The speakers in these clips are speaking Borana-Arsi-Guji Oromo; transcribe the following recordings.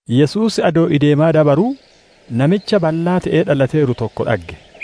Yesuus adoo ideemaa dabaruu, namicha ballaa te'ee dhalateeru tokko dhagge.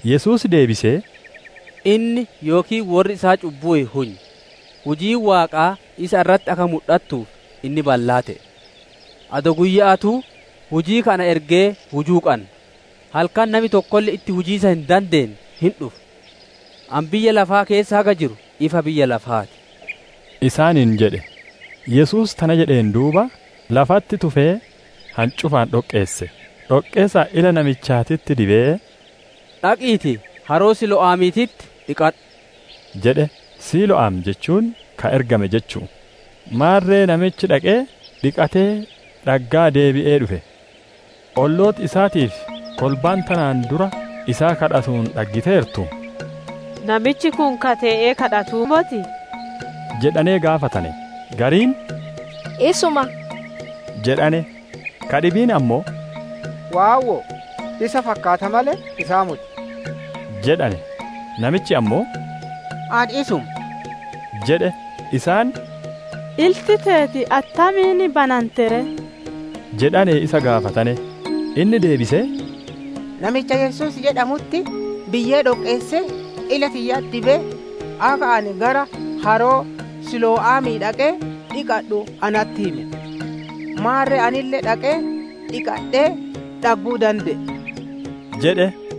Yesuus deebisee, «Inni yookiin worri isaa cubbuu hin hunye. Hujiin Waaqaa isa irratti akka mudhattuuf, inni ballaa te'e. Adoo guyya'aatuu, hujii ka ana ergee hujuu qanna; halkan nami tokkolle itti hujiisa hin dandeenne hin dhufa. Ani biyya lafaa keessa haga jiru, ifa biyya lafaa ti» isaaniin jedhe. Yesuus tana jedheen duuba, lafatti tufee hancufaan dhoqqeesse; dhoqqee san ila namichaatitti dibee, «Dhaqiitii haroo Siilo'aamiititti dhiqadhu» jedhe; «Siilo'aam» jechuun ka ergame jechu'u. Maarre namichi dhaqee, dhiqatee, dhaggaa deebi'ee dhufe. Ollooti isaatii fi kolbaan tanaan dura isaa kadhatuun dhaggiteertu, «Namichi kun ka tee'ee kadhatuu motii?» jedhanee gaafatane. Gariin, «Isuma» jedhane; ka dhibiin ammoo, «Waawwo'o, isa fakkaata malee, isaa moti» jedhane. Namichi ammoo, «Ani isuma» jedhe. Isaan, «Ilti teeti attamiin banante ree?» jedhanee isa gaafatane. Inni deebisee, «Namicha Yesuus jedhamutti biyyee dhoqqeessee, ila tiyyatti dibee, akka ani gara haroo Siilo'aamii dhaqee dhiqadhu natti hime. Maarre anille dhaqee dhiqadhee, dhagguu dande'e» jedhe.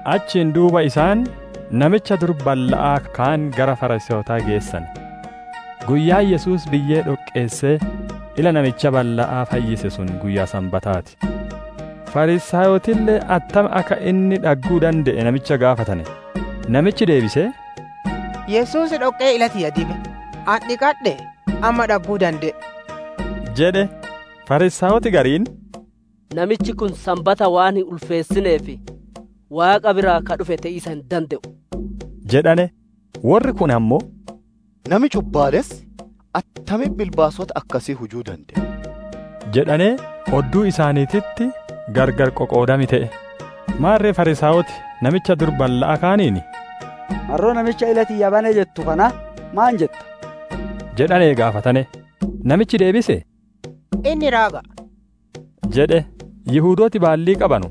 Achiin duuba isaan namicha dur balla'aa kaan gara Fariisaayotaa geessane. Guyyaan Yesuus biyyee dhoqqeessee ila namicha balla'aa fayyise sun guyyaa Sanbataa ti. Fariisaayotille attam akka inni dhagguu dande'e namicha gaafatane. Namichi deebisee, «Yesuus dhoqqee ila tiyya dibe; ani dhiqadhee, amma dhagguu dande'e!» jedhe. Fariisaayoti gariin, «Namichi kun Sanbataa waan hin ulfeessineef, Waaqa biraa ka dhufe te'iisa hin dande'u» jedhane. Worri kuun ammoo, «Nami cubbaalessi attamiin bilbaasota akkasii hujuu dande'a?» jedhanee odduu isaaniititti gargar qoqoodam te'e. Maarre Fariisaayoti namicha dur balla'aa kaaniin, «Marroo namicha ila tiyya bane jettu kanaa, maan jetta?» jedhanee gaafatane. Namichi deebisee, «Inni raaga'a» jedhe. Yihudooti baallii qabanu,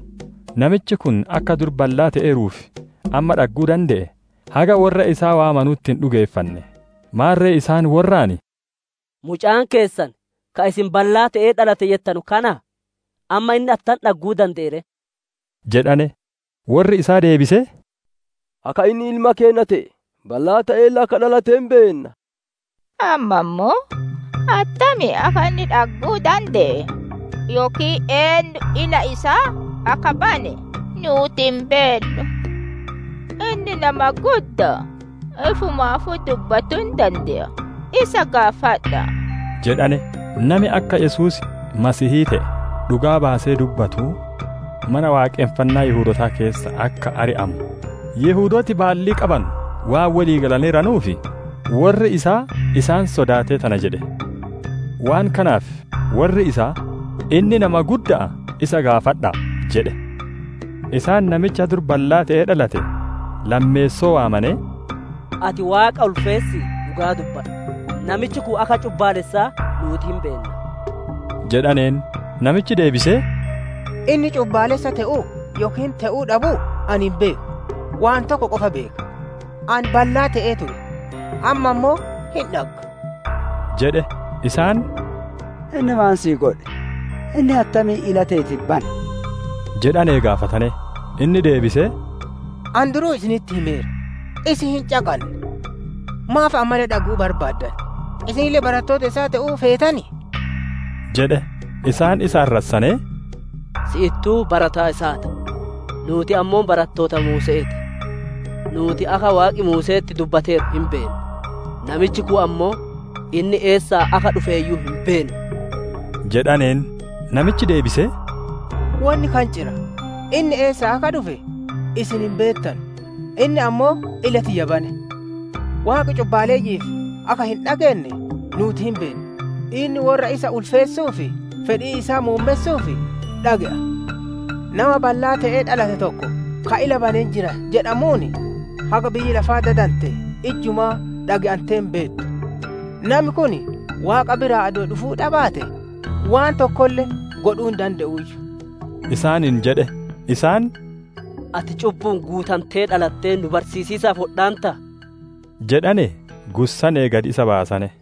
namichi kun akka dur ballaa te'eeruu fi amma dhagguu dande'e, haga worra isaa waamanutti hin dhugeeffanne. Maarre isaan worraan, «Mucaan keessan, ka isin ballaa te'ee dhalate jettanu kanaa? Amma inni attam dhagguu dande'e ree?» jedhanee gaafatane. Worri isaa deebisee, «Akka inni ilma keenna te'e, ballaa te'eelle akka dhalate hin beenna. Amma ammoo attamiin akka inni dhagguu dande'e, yookiin eennu ila isaa akka bane nuuti hin beennu. Inni nama gudda'a, ifumaafuu dubbatuu hin dande'a; isa gaafadha'a!» jedhane. Nami akka Yesuus Masiihii te'e dhugaa baasee dubbatu, Mana Waaqonfannaa Yihudootaa keessaa akka ari'amu Yihudooti baallii qabanu waan wolii galaneeranuuf, worri isaa isaan sodaatee tana jedhe. Waan kanaaf worri isaa, «Inni nama gudda'a; isa gaafadha'a!» jedhane. Isaan namicha dur ballaa te'ee dhalate lammeessoo waamanee, «Ati Waaqa ulfeessii dhugaa dubbadhu! Namichi kun akka cubbaalessaa nuuti hin beenna» jedhaneen. Namichi deebisee, «Inni cubbaalessa te'uu yookiin te'uu dhabuu ani hin beeku; waan tokko qofaa beeka: Ani ballaa te'ee ture, amma ammoo hin dhagga» jedhe. Isaan, «Inni maan sii godhe? Inni attamiin ila teeti bane?» jedhanee gaafatane. Inni deebisee, «Ani duruu isinitti himeera, isin hin caqanne. Maaf ammaalle dhage'uu barbaaddan? Isinille barattoota isaa te'uu feetanii?» jedhe. Isaan isa arrassanee, «Si'ittuu barataa isaa ti; nuuti ammoo barattoota Muuse'ee ti. Nuuti akka Waaqi Muuse'etti dubbateeru hin beenna; namichi kun ammoo, inni eessaa akka dhufeeyyuu hin beennu!» jedhaneen. Namichi deebisee, «Wonni kanciraa, inni eessaa akka dhufe isin hin beettanu! Inni ammoo ila tiyya bane! Waaqi cubbaaleyyi'iif akka hin dhageenne nuuti hin beenna; inni worra isa ulfeessuu fi fedhii isaa muummessuuf dhage'a. Nama ballaa te'ee dhalate tokko ka ila bane jira jedhamuun, haga biyyi lafaa dadantee ijjumaa dhage'antee hin beettu. Nami kun Waaqa biraa adoo dhufuu dhabaatee, waan tokkolle godhuu hin dande'uuyyu» isaaniin jedhe. Isaan, «Ati cubbu'uun guutantee dhalattee nu barsiisiisaaf wodhaantaa?» jedhanee gussanee gad isa baasane.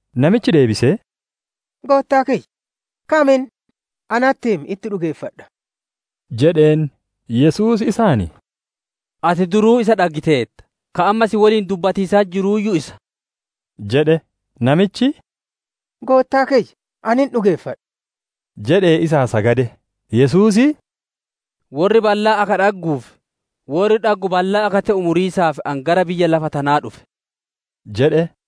Namichi deebisee, «Goottaa kiyya, kam inni? natti himi, itti dhugeeffadhaa!» jedheen. Yesuus isaan, «Ati duruu isa dhaggiteerta, ka amma si woliin dubbatiisatti jiruuyyu isa» jedhe. Namichi, «Goottaa kiyya! Ani hin dhugeeffadha» jedhee isaa sagade. Yesuus, «Worri ballaan akka dhagguu fi worri dhaggu ballaa akka te'u, muriisaaf ani gara biyya lafaa tana dhufe» jedhe.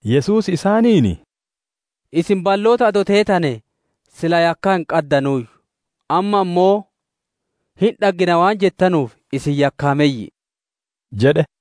Yesuus isaaniin, «Isin balloota adoo teetanee, silaa yakkaa hin qaddanuuyyu; amma ammoo hin dhaggina waan jettanuuf, isin yakkaameyyi'i» jedhe.